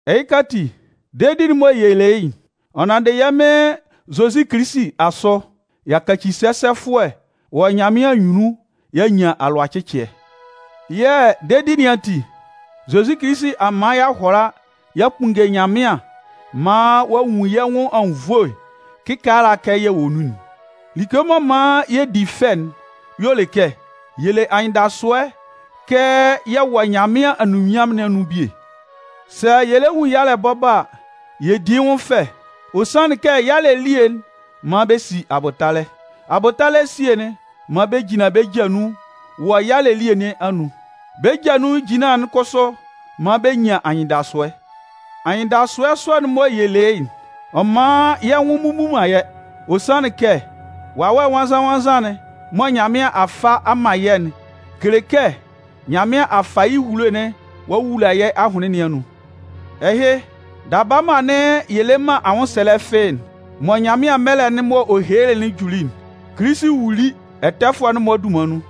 Ɛhɩka ati, dedi'n mɔ yɛ le yɩ́'n, ɔ nanndɩ yɛ́ Mɩn Zozi Kilisi asʋ, y'a kaci sɛsɛfʋɛ wɔ Nyanmɩan anyunnun y'a nyan alʋacɩcɩɛ. Yɛ̂ dedi nɩn ati, Zozi Kilisi a man y'a hʋala y'a kpunnge Nyanmɩan maan ɔ'a nwun yɛ́ nwʋn anwunnvoe kɩkaala kɛ yɛ wɔ nun'n. Like m'ɔ man yɛ di fɛ'n y'ɔ le kɛ, yɛ le anyɩndasʋɛ kɛ yɛ wɔ Nyanmɩan anunminnyanmʋn nɩn anun bie. Sɛ yɛ lɛ nwun yalɛ bɔbɔ a, yɛ di yɩ́ nwʋn fɛ. Ɔ sanlɩn kɛ yalɛ elie'n man bɛ si abʋtalɛ. Abʋtalɛ esie'n man bɛ jinlan bɛ́ ja nun wɔ yalɛ elie nɩn anun. Bɛ́ ja nun ejinlan'n kʋsʋ man bɛ nyan anyɩndasʋɛ. Anyɩndasʋɛ sɔ'n mɔ yɛ le yɩ́'n, ɔ man yɛ́ nwʋn mmubu man yɛ́. Ɔ sanlɩn kɛ Wawɛ Nwannzan-nwannzan'n mɔ Nyanmɩan a fa man yɛ́'n kele kɛ Nyanmɩan a fa yɩ́ ehulo'n ɔ'a wula yɛ́ ahʋnlɩn nɩn anun. Ɛhɩ, daba mɔ anɩn yɛ le man anwʋnsɛlɛ fɩ́ɩ́'n, mɔ Nyanmɩan mɛlɛ'n m'ɔ helelɩ'n juli'n, Kilisi wuli ɛtɛfʋɛ'n-mɔ dunman nun.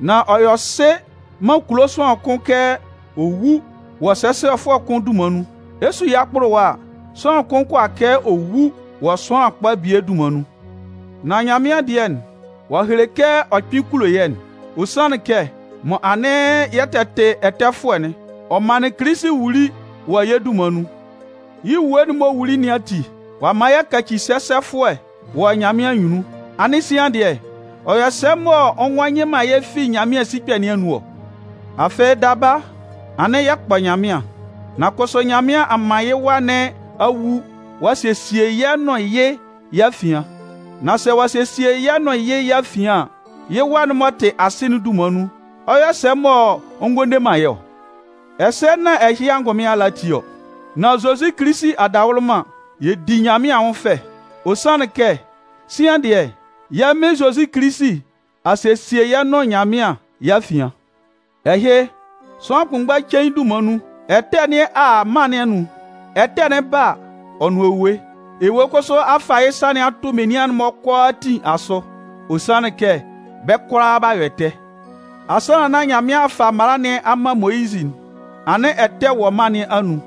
Nan ɔ yɔ sɩ man kulo sʋanlan kʋn kɛ ɔ wú wɔ sɛsɛfʋɛ kʋn dunman nun. Ɛ 'su yɩ́ akpʋlʋwa a, sʋanlan kʋn kʋala kɛ ɔ wu wɔ sʋanlan kpa bie dunman nun. Nan Nyanmɩan dɩɛ, ɔ'a hele kɛ ɔ kpɩn kulo yɛ́'n. Ɔ sanlɩn kɛ mɔ anɩn yɛ tɛ tɩ ɛtɛfʋɛ'n, ɔ manlɩn Kilisi wuli wɔ yɛ́ dunman nun. Yɩ́ ewue'n m'ɔ wuli nɩn ati, ɔ'a man y'a kaci sɛsɛfʋɛ wɔ Nyanmɩan anyunnun. Anɩn sian dɩɛ, ɔ yɔ sɛ mɔ ɔ ngɔ yɩ man yɛ́ fi Nyanmɩan sikpɛ nɩn anun ɔ? Afɩ daba, anɩn yɛ kpɔ Nyanmɩan. Nan kʋsʋ Nyanmɩan a man yɩ Wa nɩn a wu ɔ'a sesie yɛ́ nʋn yɩ́ yɛ́ afian. Nan sɛ ɔ'a sesie yɛ́ nʋn yɩ́ yɛ́ afian an, yɩ́ Wa'n m'ɔ tɩ asɩ'n dunman nun, ɔ yɔ sɛ mɔ ɔ ngɔ le man yɛ́ ɔ? Ɛsɛ nán ɛhɩ angʋnmɩn ala ati ɔ, nan Zozi Kilisi adawʋlʋman, yɛ di Nyanmɩan anwʋn fɛ. Ɔ sanlɩn kɛ sian dɩɛ, yɛ́ Mɩn Zozi Kilisi a sesie yɛ́ nʋn Nyanmɩan yɛ́ afian. Ɛhɩ, sʋanlan kʋnmgba cein dunman nun, ɛtɛ nɩn a a mân nɩn anun. Ɛtɛ'n 'ba a, ɔ nʋn ewue. Ewue kʋsʋ a fa yɩ́ sa a tʋ menian'n-mɔ kʋalaatin asʋ, ɔ sanlɩn kɛ bɛ́ kʋalaa b'a yɔ ɛtɛ. Asannan nán Nyanmɩan a fa mala nɩn a man Moyizɩ'n, anɩn ɛtɛ'n wɔ mân nɩn anun.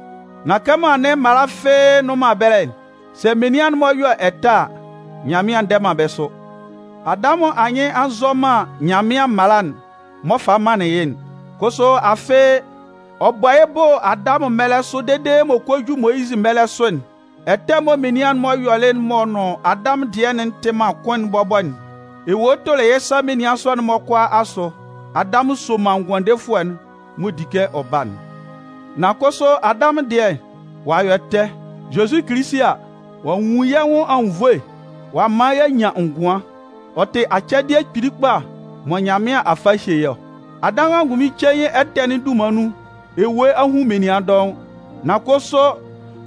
Nan kɛmɔ anɩn mala fɩ́ɩ́ nnʋn man ɛbɛlɛ'n, sɛ menian'n-mɔ yɔ ɛtɛ a, Nyanmɩan ndɛ man bɛ́ sʋ. Adamʋn anyɩn a nzɔ man Nyanmɩan mala'n m'ɔ falɩ manlɩn yɩ́'n. Kʋsʋ afɩ, ɔ bɔ yɩ́ bʋ Adamʋn mɛlɛ sʋ dede m'ɔ kɔ ju Moyizɩ mɛlɛ sʋ'n, ɛtɛ mɔ menian'n-mɔ yɔlɩ m'ɔ nʋn Adamʋn dɩɛ'n tɩ man kʋn bɔbɔ'n, ewue tʋlɩ yɩ́ sa menian sɔ'n-mɔ kʋalaa asʋ. Adamʋn soman Ngʋandefʋɛ'n mɔ di kɛ ɔ ba'n. Nan kʋsʋ Adamʋn dɩɛ, ɔ'a yɔ ɛtɛ. Zozi Kilisi a, ɔ'a nwun yɛ́ nwʋn anwunnvoe ɔ'a man y'a nyan ngʋan. Ɔ tɩ acɛdɩɛ kpili kpa mɔ Nyanmɩan a fa a hye yɛ́ ɔ. Adamʋn angʋnmɩn cein ɛtɛ'n dunman nun, ewue a hun menian dɔʋn. Nan kʋsʋ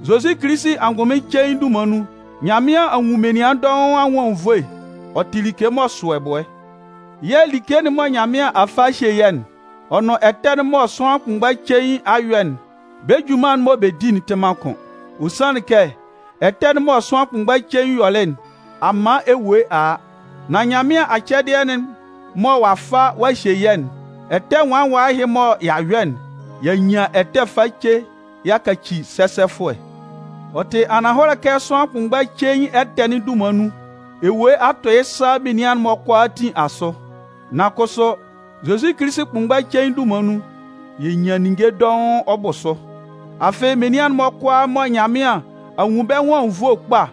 Zozi Kilisi angʋnmɩn cein dunman nun, Nyanmɩan a nwun menian dɔʋn anwʋn anwunnvoe. Ɔ tɩ like m'ɔ sʋ ɛbʋɛ. Yɛ̂ like'n mɔ Nyanmɩan a fa a hye yɛ̂'n, ɔ nʋn ɛtɛ'n mɔ sʋanlan kʋnmgba cein a yɔ'n, bɛ́ junman'n mɔ bɛ di'n tɩ man kʋn. Ɔ sanlɩn kɛ ɛtɛ'n mɔ sʋanlan kʋnmgba cein yɔlɩ'n, a man ewue a a. Nan Nyanmɩan acɛdɩɛ'n mɔ ɔ'a fa ɔ'a hye yɛ́'n, ɛtɛ nwala nwala ɛhɩ mɔ y'a yɔ'n, y'a nyan ɛtɛ face y'a kaci sɛsɛfʋɛ. Ɔ tɩ ananhɔlɛ kɛ sʋanlan kʋnmgba cein ɛtɛ'n dunman nun, ewue a tʋ yɩ́ sa menian'n-mɔ kʋalaatin asʋ. Nan kʋsʋ, Zozi Kilisi kʋnmgba cein dunman nun, yɛ nyan ninnge dɔʋn ɔ bʋ sʋ. Afɩ menian'n-mɔ kʋalaa mɔ Nyanmɩan a nwun bɛ́ nwʋn anwunnvoe kpa,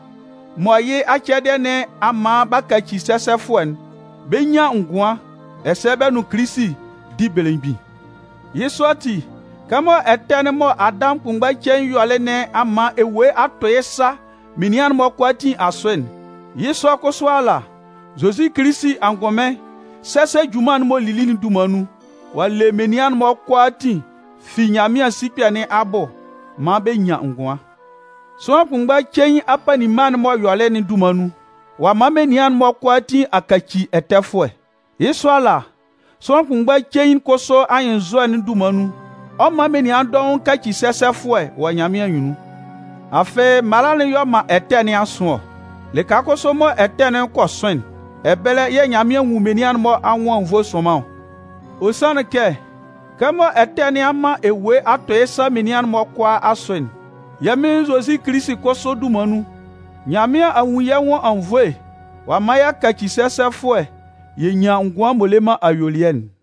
mɔ yɩ́ acɛdɩɛ nɩn a man b'a kaci sɛsɛfʋɛ'n, bɛ 'nyan ngʋan, ɛsɛ bɛ nʋn Kilisi 'di belemgbin. Yɩ́ sɔ ati, kɛmɔ ɛtɛ'n mɔ Adamʋn kʋnmgba cein yɔlɩ nɩn a man ewue a tʋ yɩ́ sa menian'n-mɔ kʋalaatin asʋ'n, yɩ́ sɔ kʋsʋ ala, Zozi Kilisi angʋnmɩn sɛsɛ junman'n m'ɔ lili'n dunman nun, ɔ'a le menian'n-mɔ kʋalaatin fi Nyanmɩan sikpɛ nɩn abʋ maan bɛ nyan ngʋan. Sʋanlan kʋnmgba cein apanninma'n m'ɔ yɔlɩ'n dunman nun, ɔ'a man menian'n-mɔ kʋalaatin a kaci ɛtɛfʋɛ. Yɩ́ sɔ ala, sʋanlan kʋnmgba cein kʋsʋ anyɩnnzɔ'n dunman nun, ɔ 'man menian dɔʋn a kaci sɛsɛfʋɛ wɔ Nyanmɩan anyunnun. Afɩ, mala'n y'ɔ man ɛtɛ nɩn a sʋn ɔ. Lɩka kʋsʋ mɔ ɛtɛ'n kɔ sʋn'n, ɛbɛlɛ yɛ̂ Nyanmɩan nwun menian'n-mɔ anwʋn anwunnvoe sʋnman ɔ. Ɔ sanlɩn kɛ, kɛmɔ ɛtɛ nɩn a man ewue a tʋ yɩ́ sa menian'n-mɔ kʋalaa asʋ'n, yɛ́ Mɩn Zozi Kilisi kʋsʋ dunman nun, Nyanmɩan a nwun yɛ́ nwʋn anwunnvoe ɔ'a man y'a kaci sɛsɛfʋɛ yɛ nyan ngʋan m'ɔ le man ayuelɩɛ'n.